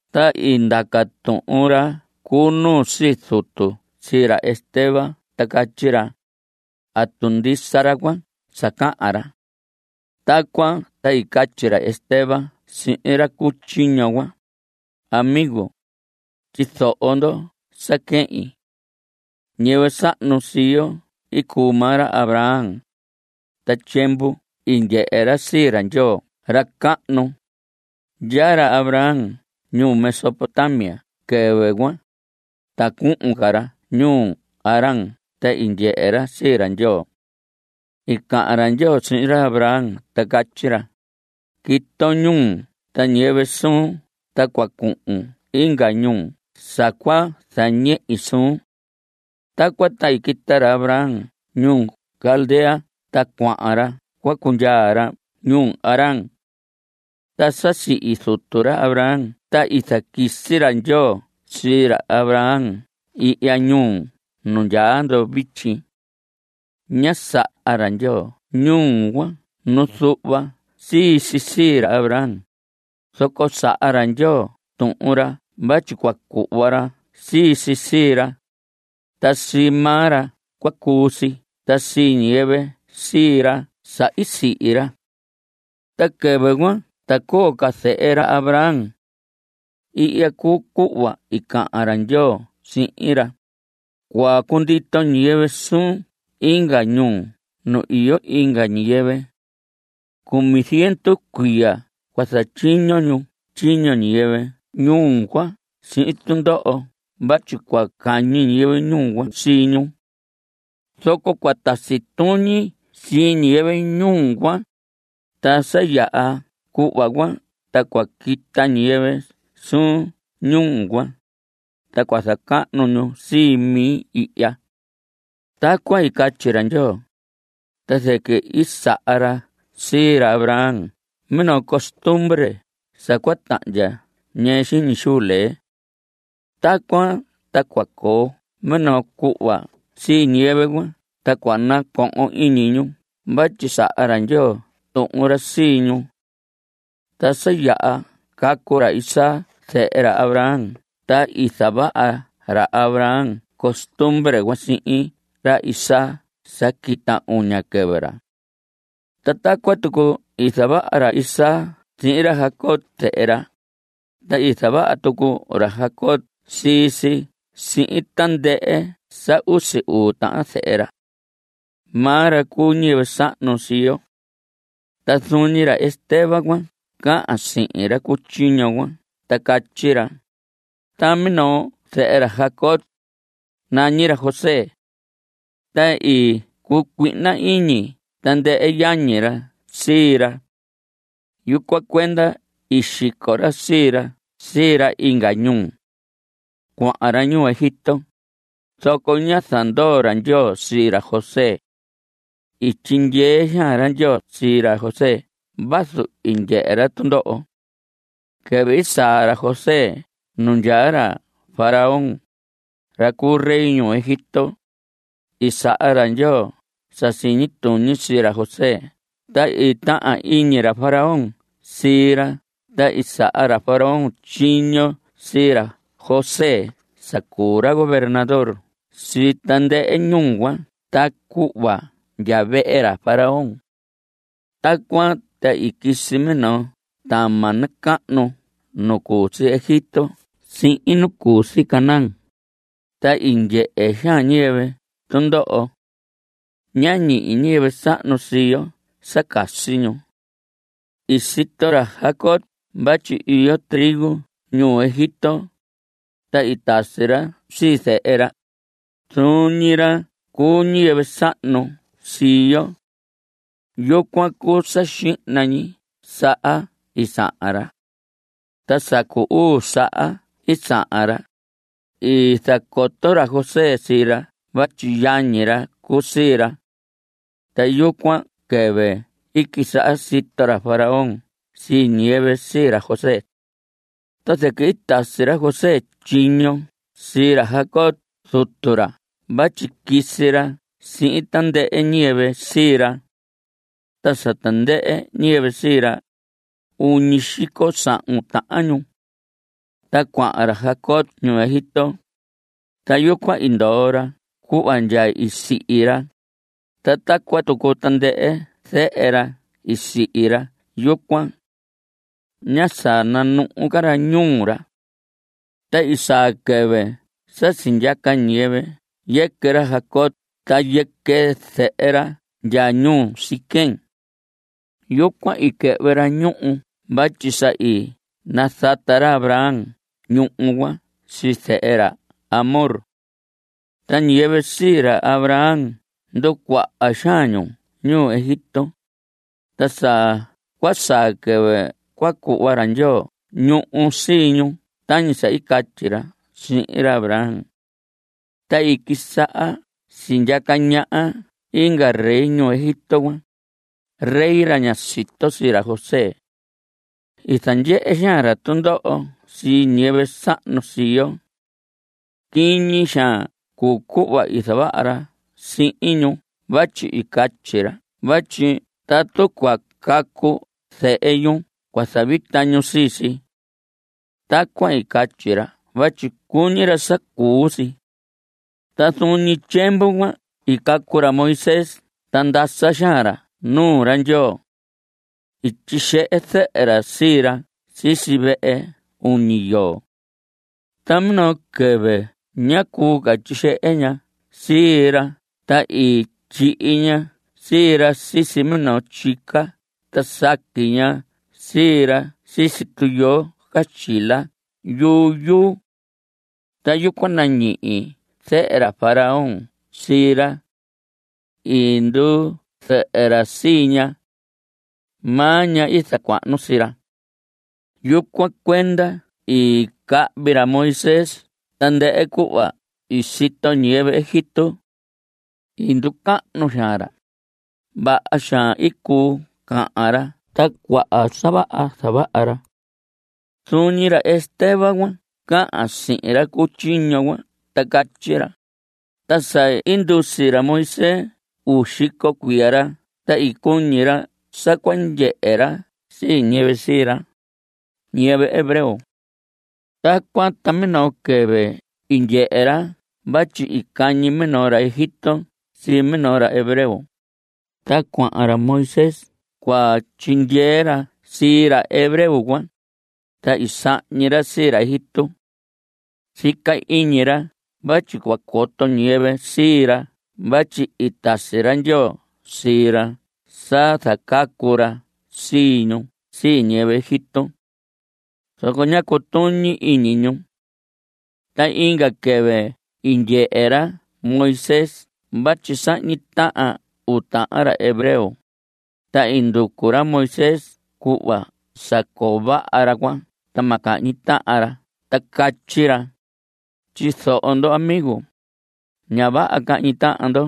Ta i ndaca tuhun ra cu nuu sii zutu sii ra Esteban ta catyi ra: ¿Atu ndisa ra cuan sa cahan ra? Tacuan ta i catyi ra Esteban sihin ra cu tyiño cuan: Amigos. Tyizoho ndo sa quehin. Ñiyɨvɨ sahnu sii yo i cuu maa ra Abraham. Ta tyiemvu i ndyehe ra sii ra Ndyoo ra cahnu. Ndyaa ra Abraham ñuu Mesopotamia quɨvɨ cuan, ta cuhun ca ra ñuu Harán ta i ndyehe ra sii ra Ndyoo. I cahan ra Ndyoo sihin ra Abraham ta catyi ra: “Quiton ñuun ta ñiyɨvɨ suun ta cua cuhun inga ñuu sa cua zañehi suun.” Tacuan ta i quita ra Abraham ñuu Caldea ta cuahan ra cua cundyaa ra ñuu Harán. Ta sa sihi zutu ra Abraham ta i zaquisi ra Ndyoo sii ra Abraham ihya ñuu nu ndyaa ndo vityi. Ñá saha ra Ndyoo ñuhu cuan nu zuhva si sii ra Abraham, zoco saha ra Ndyoo tuhun ra vatyi cua cuhva ra sii si sii ra, ta sii maa ra cua cuu si ta sii ñiyɨvɨ sii ra sa i sihi ra. Ta quɨvɨ cuan ta coo ca zehe ra Abraham. Ihya cuu cuhva i cahan ra Ndyoo sihin ra: “Cua cundito ñiyɨvɨ suun inga ñuu nu iyo inga ñiyɨvɨ. Cumi ziendu cuiya cua zatyiño ñu tyiño ñiyɨvɨ ñuu cuan sihin tundoho vatyi cua cañi ñiyɨvɨ ñuu cuan sii ñu. Zoco cua tasi tuñi sii ñiyɨvɨ ñuu cuan, ta sa yaha cuhva cuan ta cua quita ñiyɨvɨ suun ñuu cuan, ta cua zacahnu ñu sii mi ihya.” Tacuan i catyi ra Ndyoo, ta zɨquɨ i saha ra sii ra Abraham minoo costumbre sa cua tahndya ñɨɨ xiñi xuu lee. Tacuan ta cua coo minoo cuhva sii ñiyɨvɨ cuan ta cua nacohon iñi ñu vatyi saha ra Ndyoo tuhun ra sii ñu. Ta sa yaha cacu ra Isaac zehe ra Abraham ta i zavaha Abraham costumbre cuan sihin ra Isaac sa quita uña quɨvɨ ra. Ta tacuan tucu i zavaha ra Isaac sihin ra Jacob zehe ra, ta i zavaha tucu ra Jacob sii si sihin tandɨhɨ sa usi uu tahan zehe ra. Maa ra cuu ñiyɨvɨ sahnu sii yo. Ta zuun ñi ra Esteban cuan cahan sihin ra cu tyiño cuan ta catyi ra: Ta minoo zehe ra Jacob, nañi ra José. Ta i cucuihna iñi tandɨhɨ yañi ra sii ra. Yucuan cuenda i xico ra sii ra sii ra inga ñuu. Cuahan ra ñuu Egipto, zoco ñá zandoo ra Ndyoo sii ra José. I tyindyee xaan ra Ndyoo sii ra José vazu i ndyehe ra tundoho. Quɨvɨ i saa ra José nu ndyaa ra Faraón, ra cu rey ñuu Egipto, i saha ra Ndyoo sa siñi tuñi sii ra José ta i tahan iñi ra Faraón sii ra ta i saha ra Faraón tyiño sii ra José sa cuu ra gobernador sii tandɨhɨ ñuu cuan ta cuhva ndya vehe ra Faraón. Tacuan ta i quisi minoo tama nacahnu nu cu si Egipto sihin nu cu si Caanán, ta i ndyehe xaan ñiyɨvɨ tundoho. Ñá ñihi ñiyɨvɨ sahnu sii yo sa casi ñu. I sito ra Jacob vatyi iyo trigo ñuu Egipto, ta i tasi ra sii zehe ra, zuun ñi ra cu ñiyɨvɨ sahnu sii yo. Yucuan cuu sa xihna ñi saha i sahan ra. Ta sa cu uu saha i sahan ra, i zacoto ra José sii ra vatyi yañi ra cuu sii ra. Ta yucuan quɨvɨ i quisaha sito ra Faraón sii ñiyɨvɨ sii ra José. Ta zɨquɨ i tasi ra José tyiño sii ra Jacob zutu ra vatyi quisi ra sihin tandɨhɨ ñiyɨvɨ sii ra. Ta sa tandɨhɨ ñiyɨvɨ sii ra, uñi xico sahun tahan ñu. Ta cuahan ra Jacob ñuu Egipto. Ta yucuan i ndoo ra cuhva ndya i sihi ra, ta tacuan tucu tandɨhɨ zehe ra i sihi ra yucuan. Ñá sananuhu ca ra ñuu ra. Ta i saa quɨvɨ sa sindyaca ñiyɨvɨ yɨquɨ ra Jacob ta yɨquɨ zehe ra ndya ñuu Siquem. Yucuan i quɨhvɨ ra ñuhu vatyi sa i nazata ra Abraham ñuhu cuan sii zehe ra Hamor. Ta ñiyɨvɨ sii ra Abraham i nducuaha xaan ñu ñuu Egipto, ta sa cua saa quɨvɨ cua cuhva ra Ndyoo ñuhu sii ñu tañi sa i catyi ra sihin ra Abraham. Ta i quisaha sindyaca ñaha inga rey ñuu Egipto cuan, rey ra ñá sito sii ra José. I zandyehe xaan ra tundoho sii ñiyɨvɨ sahnu sii yo. Quiñi xaan cuu cuhva i zavaha ra sihin ñu vatyi i catyi ra vatyi tatu cua cacu zehe ñu cua zavita ñu sii si. Tacuan i catyi ra vatyi cuñi ra sa cuu si. Ta zuun ñi tyiemvu cuan i cacu ra Moisés ta ndasa xaan ra nuu ra Ndyoo. I tyixehe zɨhɨ ra sii ra sisi vehe uñi yoo. Ta minoo quɨvɨ ñá cuu ca tyixehe ña sii ra ta i tyihi ña sii ra sisi minoo tyica ta saqui ña sii ra sisi tuyoo caxtyila yuyuu. Ta yucuan nañihi zehe ra Faraón sii ra. I nduu zehe ra sii ña. Maa ña i zacuahnu sii ra. Yucuan cuenda i cahvi ra Moisés tandɨhɨ cuhva i sito ñiyɨvɨ Egipto. I nducahnu xaan ra. Vaha xaan i cuu cahan ra ta cuaha sa vaha i zavaha ra. Zuun ñi ra Esteban cuan cahan sihin ra cu tyiño cuan ta catyi ra: Ta sa i ndusi ra Moisés uu xico cuiya ra ta i cuñi ra sa cua ndyehe ra sii ñiyɨvɨ sii ra, ñiyɨvɨ hebreo. Tacuan ta minoo quɨvɨ i ndyehe ra vatyi i cañi minoo ra Egipto sii minoo ra hebreo, ta cuahan ra Moisés cua tyindyee ra sii ra hebreo cuan, ta i sahñi ra sii ra Egipto. Sica iñi ra vatyi cua coto ñiyɨvɨ sii ra vatyi i tasi ra Ndyoo sii ra sa zacacu ra sii ñu sii ñiyɨvɨ Egipto. Zoco ñá cutuñi iñi ñu. Ta inga quɨvɨ i ndyehe ra Moisés vatyi sahñi tahan uu tahan ra hebreo, ta i nducu ra Moisés cuhva sa coo vaha ra cuan ta ma cahñi tahan ca ra ta catyi ra: “Tyizoho ndo, amigo. Ña vaha cahñi tahan ndo.”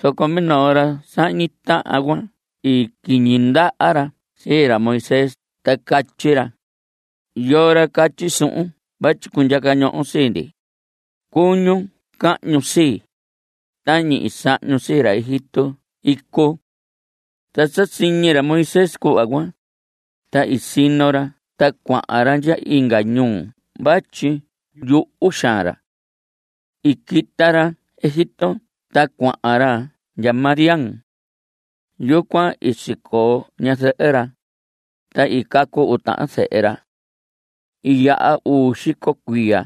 Zoco minoo ra sahñi tahan cuan i quiñi ndaha ra sii ra Moisés ta catyi ra: “¿Yoo ra catyi suhun vatyi cundyaca ñohon sii ndi? Cuñun cahñun sii, tañi i sahñun sii ra Egipto icu.” Ta sa siñi ra Moisés cuhva cuan, ta i sino ra ta cuahan ra ndya inga ñuu vatyi yuhu xaan ra. I quita ra Egipto ta cuahan ra ndya Madián. Yucuan i sicoo ñazɨhɨ ra, ta i cacu uu tahan zehe ra. I yaha uu xico cuiya.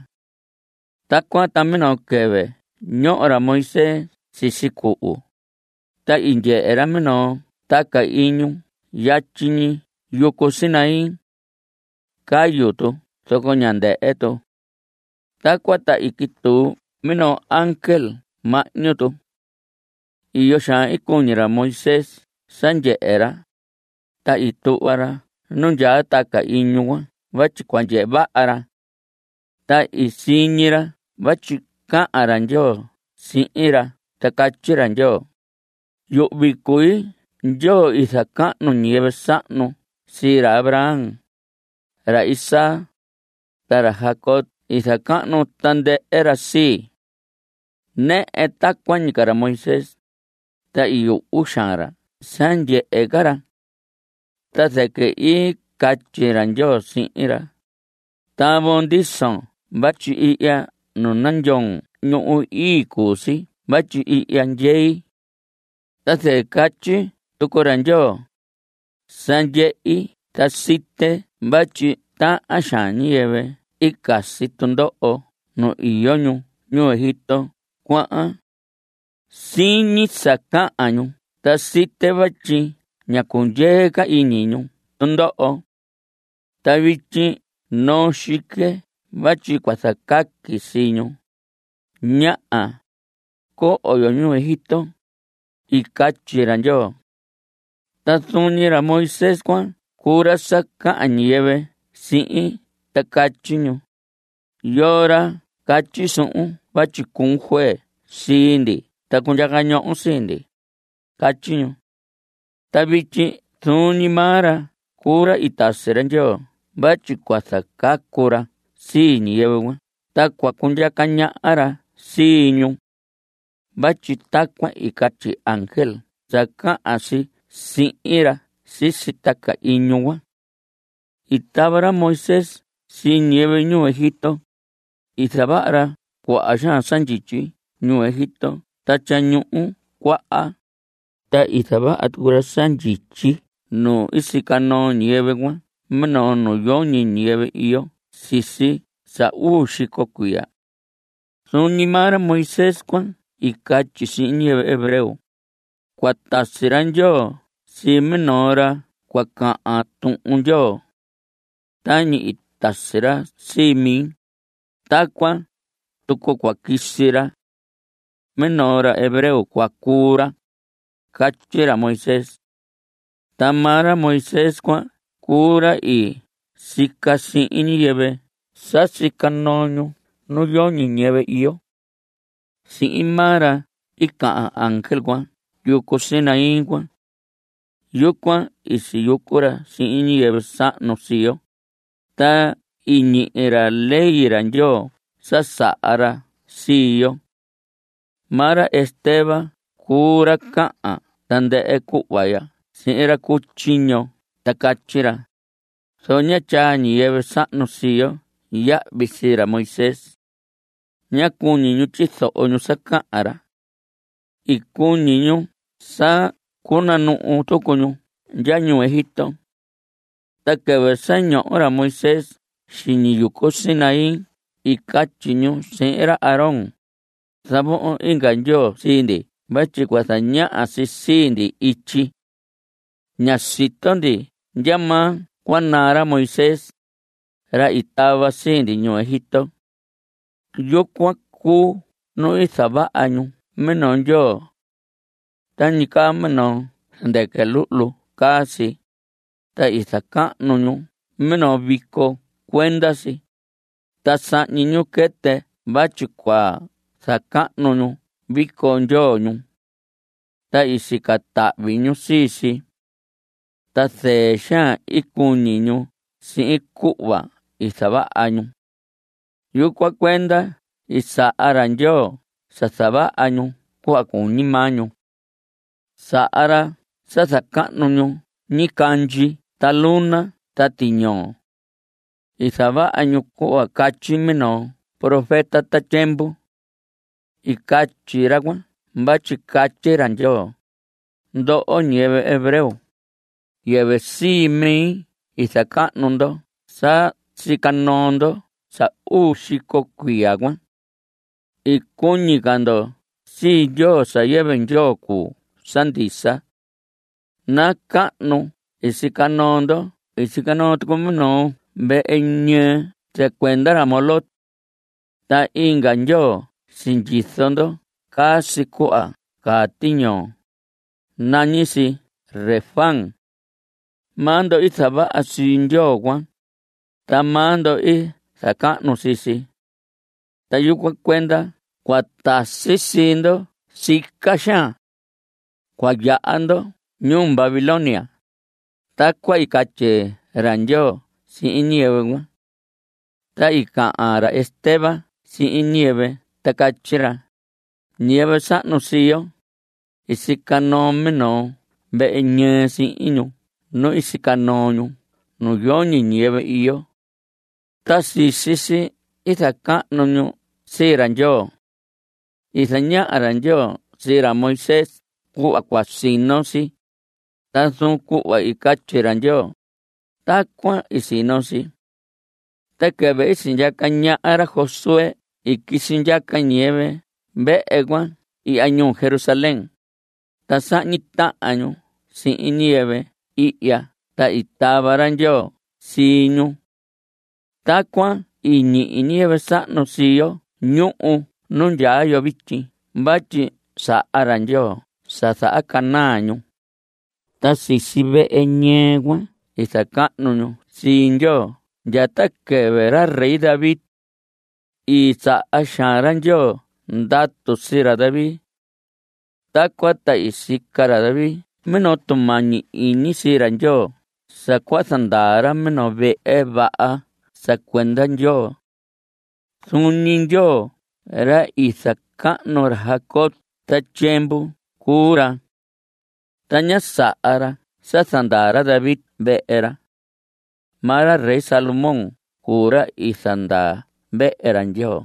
Tacuan ta minoo quɨvɨ ñoho ra Moisés sisi cuhu, ta i ndyehe ra minoo taca iñu yatyi ñi yucu Sinaí. Cayu tu zoco ñá ndɨhɨ tu. Tacuan ta i quituu minoo ángel mahñu tu. Iyo xaan i cuñi ra Moisés sa ndyehe ra, ta i tuhva ra nu ndyaa taca iñu cuan vatyi cua ndyehe vaha ra. Ta i siñi ra vatyi cahan ra Ndyoo sihin ra ta catyi ra Ndyoo: “Yuhvi cui Ndyoo. I zacahnu ñiyɨvɨ sahnun sii. Ra Abraham, ra Isaac, ta ra Jacob i zacahnu tandɨhɨ ra sii.” Nɨhɨ tacuan ñi ca ra Moisés, ta i yuhu xaan ra sa ndyehe ca ra. Ta zɨquɨ i catyi ra Ndyoo sihin ra: “Tavon ndison vatyi ihya nu nandyoon ñuhu ii cuu si vatyi ihya ndyei.” Ta zɨquɨ catyi tucu ra Ndyoo: “Sa ndyehi ta site vatyi tahan xaan ñiyɨvɨ i casi tundoho nu iyo ñu ñuu Egipto cuan. Siñi sa cahan ñu ta site vatyi ña cundyee ca iñi ñu tundoho. Ta vityi noo xique vatyi cua zacaqui sii ñu. Ñaha. Coho yo ñuu Egipto.” I catyi ra Ndyoo. Ta zuun ñi ra Moisés cuan cuu ra sa cahan ñiyɨvɨ sihin ta catyi ñu: “¿Yoo ra catyi suhun vatyi cuun juez sii ndi ta cundyaca ñohon sii ndi?” Catyi ñu. Ta vityi zuun ñi maa ra cuu ra i tasi ra Ndyoo vatyi cua zacacu ra sii ñiyɨvɨ cuan ta cua cundyaca ñaha ra sii ñu. Vatyi tacuan i catyi ángel sa cahan si sihin ra sisi taca iñu cuan. I tava ra Moisés sii ñiyɨvɨ ñuu Egipto. I zavaha ra cuaha xaan sa ndyityi ñuu Egipto ta Tyañuhu Cuaha. Ta i zavaha tucu ra sa ndyityi nu i sica noo ñiyɨvɨ cuan minoo nu yoñi ñiyɨvɨ iyo sisi sa uu xico cuiya. Zuun ñi maa ra Moisés cuan i catyi sihin ñiyɨvɨ hebreo: “Cua tasi ra Ndyoo sii minoo ra cua cahan Tuhun Ndyoo. Tañi i tasi ra sii mi, tacuan tucu cua quisi ra. Minoo ra hebreo cua cuu ra.” Catyi ra Moisés. Ta maa ra Moisés cuan cuu ra i sica sihin ñiyɨvɨ sa sica noo ñu nu yoñi ñiyɨvɨ iyo. Sihin maa ra i cahan ángel cuan yucu Sinaí cuan. Yucuan i siyucu ra sihin ñiyɨvɨ sahnu sii yo, ta i ñihi ra Ley ra Ndyoo sa saha ra sii yo. Maa ra Esteban cuu ra cahan tandɨhɨ cuhva ya sihin ra cu tyiño ta catyi ra: Zoco ñá tyaa ñiyɨvɨ sahnu sii yo yahvi sii ra Moisés. Ñá cuñi ñu tyizoho ñu sa cahan ra. I cuñi ñu sa cunanuhu tucu ñu ndya ñuu Egipto. Ta quɨvɨ sa ñoho ra Moisés xiñi yucu Sinaí i catyi ñu sihin ra Aarón: “Zavohon inga ndyoo sii ndi vatyi cua zañaha si sii ndi ityi. Ña sito ndi ndya ma cua naa ra Moisés, ra i tava sii ndi ñuu Egipto.” Yucuan cuu nu i zavaha ñu minoo ndyoo. Tañi caa minoo zɨndɨquɨ luhlu caa si, ta i zacahnu ñu minoo vico cuenda si, ta sahñi ñu quɨtɨ vatyi cua zacahnu ñu vico ndyoo ñu. Ta i sica tahvi ñu sii si. Ta zɨɨ xaan i cuñi ñu sihin cuhva i zavaha ñu. Yucuan cuenda i saha ra Ndyoo sa zavaha ñu cuhva cuñi maa ñu. Saha ra sa zacahnu ñu ñicandyi ta luna ta tiñoo. I zavaha ñu cuhva catyi minoo profeta ta tyiemvu. I catyi ra cuan vatyi catyi ra Ndyoo: Ndoho ñiyɨvɨ hebreo. Yɨvɨ sii mi i zacahnu ndo sa sica noo ndo sa uu xico cuiya cuan. I cuñi ca ndo sii ndyoo sa yɨvɨ Ndyoo cuu sa ndisa. Nacahnu nu i sica noo ndo i sica noo tucu minoo vehe ñɨɨ sa cuenda ra Moloc. Ta inga ndyoo sindyizo ndo caa si cuhva caa tiñoo. Nañi si Renfán. Maa ndo i zavaha sii ndyoo cuan, ta maa ndo i zacahnu sii si. Ta yucuan cuenda cua tasi sii ndo sica xaan. Cua yaha ndo ñuu Babilonia. Tacuan i catyi ra Ndyoo sihin ñiyɨvɨ cuan. Ta i cahan ca ra Esteban sihin ñiyɨvɨ ta catyi ra: Ñiyɨvɨ sahnu sii yo, i sica noo minoo vehe ñɨɨ sihin ñu nu i sica noo ñu nu yoñi ñiyɨvɨ iyo. Ta sisi si i zacahnu ñu sii ra Ndyoo. I zañaha ra Ndyoo sii ra Moisés cuhva cua sino si, ta zuun cuhva i catyi ra Ndyoo, tacuan i sino si. Ta quɨvɨ i sindyaca ñaha ra Josué i quisi ndyaca ñiyɨvɨ vehe cuan ihya ñuu Jerusalén, ta sahñi tahan ñu sihin ñiyɨvɨ ihya ta i tava ra Ndyoo sii ñu. Tacuan i ñihi ñiyɨvɨ sahnu sii yo ñuhu nu ndyaa yo vityi vatyi saha ra Ndyoo sa zahacanaa ñu. Ta sisi vehe ñɨɨ cuan i zacahnu ñu sii Ndyoo ndya ta quɨvɨ ra rey David. I saha xaan ra Ndyoo ndatu sii ra David. Tacuan ta i sica ra David minoo tumañi iñi sii Ndyoo sa cua zandaa ra minoo vehe vaha sa cuenda Ndyoo. Zuun ñi Ndyoo ra i zacahnu ra Jacob ta tyiemvu cuu ra. Ta ñá saha ra sa zandaa ra David vehe ra. Maa ra rey Salomón cuu ra i zandaa vehe ra Ndyoo.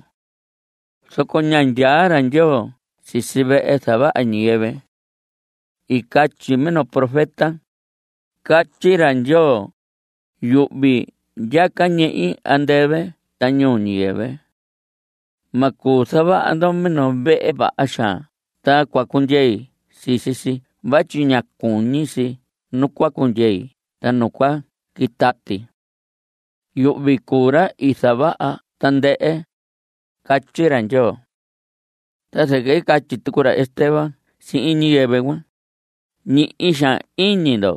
Zoco ña ndyaa ra Ndyoo sisi vehe zavaha ñiyɨvɨ. I catyi minoo profeta: Catyi ra Ndyoo: Yuhvi ndyaca ñehi andɨvɨ ta ñuu ñiyɨvɨ. Ma cuu zavaha ndo minoo vehe vaha xaan ta cua cundyei sisi si vatyi ña cuñi si nu cua cundyei ta nu cua quitati. Yuhvi cuu ra i zavaha tandɨhɨ. Catyi ra Ndyoo. Ta zɨquɨ i catyi tucu ra Esteban sihin ñiyɨvɨ cuan: Ñihi xaan iñi ndo.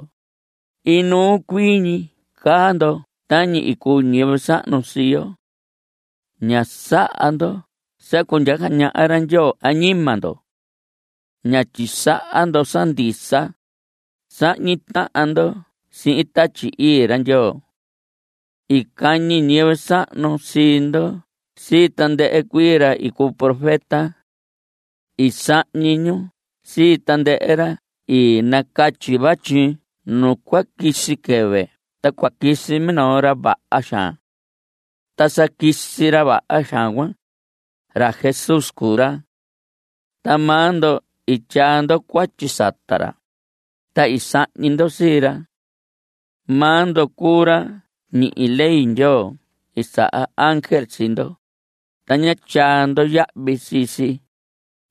Inuu cuii ñi caa ndo tañi i cuu ñiyɨvɨ sahnu sii yo. Ña saha ndo sa cundyaca ñaha ra Ndyoo añima ndo. Ña tyisaha ndo sa ndisa. Sahñi tahan ndo sihin Tatyi Ii ra Ndyoo. I cañi ñiyɨvɨ sahnu sii ndo sii tandɨhɨ cuii ra i cuu profeta. I sahñi ñu sii tandɨhɨ ra i nacatyi vatyi nu cua quisi quɨvɨ ta cua quisi minoo ra vaha xaan. Ta sa quisi ra vaha xaan cuan, ra Jesús cuu ra. Ta maa ndo i tyaa ndo cuatyi sata ra, ta i sahñi ndo sii ra. Maa ndo cuu ra ñihi ley Ndyoo i saha ángel sii ndo, ta ña tyaa ndo yahvi sii si.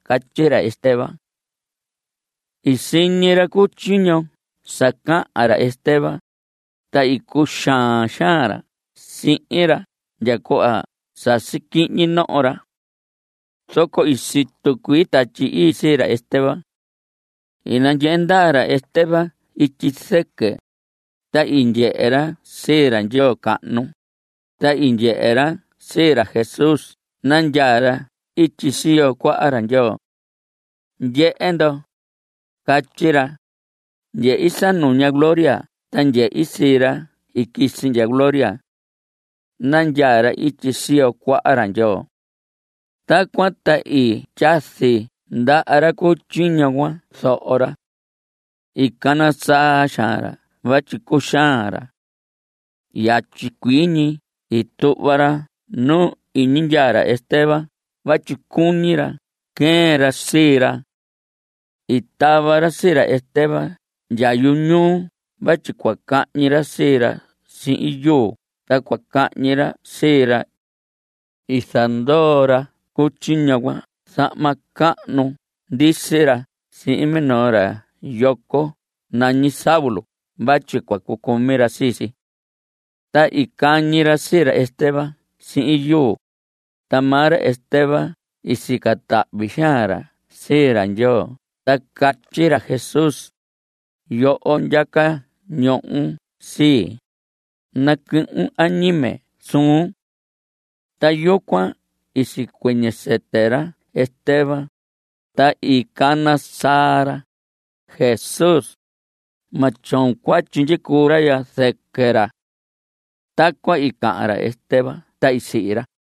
Catyi ra Esteban. I siñi ra cu tyiño sa cahan ra Esteban, ta i cuxaan xaan ra sihin ra ndya cuhva sasi quihñi noho ra. Zoco i situ cuii Tatyi Ii sii ra Esteban. I nandyehe ndaa ra Esteban ityi zɨquɨ, ta i ndyehe ra sii ra Ndyoo cahnu, ta i ndyehe ra sii ra Jesús nandyaa ra ityi siyo cuaha ra Ndyoo. Ndyehe ndo, catyi ra. Ndyehi sa nuña gloria ta ndyehi sii ra i quisi ndya gloria. Nandyaa ra ityi siyo cuaha ra Ndyoo. Tacuan ta i tyazi ndaha ra cu tyiño cuan zoho ra. I cana saa xaan ra vatyi cuxaan ra. Yatyi cuii ñi i tuhva ra nu iñi ndyaa ra Esteban vatyi cuñi ra queen ra sii ra. I tava ra sii ra Esteban ndya yu ñuu vatyi cua cañi ra sii ra sihin yuu ta cua cahñi ra sii ra. I zandoo ra cu tyiño cuan zahma cahnu ndisi ra sihin minoo ra yoco nañi Saulo vatyi cua cucumi ra sii si. Ta i cañi ra sii ra Esteban sihin yuu, ta maa ra Esteban i sica tahvi xaan ra sii ra Ndyoo ta catyi ra: Jesús yoho ndyaca ñohon sii. Nacuhun añime suhun. Ta yucuan i sicuɨñɨ sɨtɨ ra Esteban, ta i cana saa ra: Jesús, ma tyoon cuatyi ndyicuu ra ya zɨquɨ ra. Tacuan i cahan ra Esteban ta i sihi ra.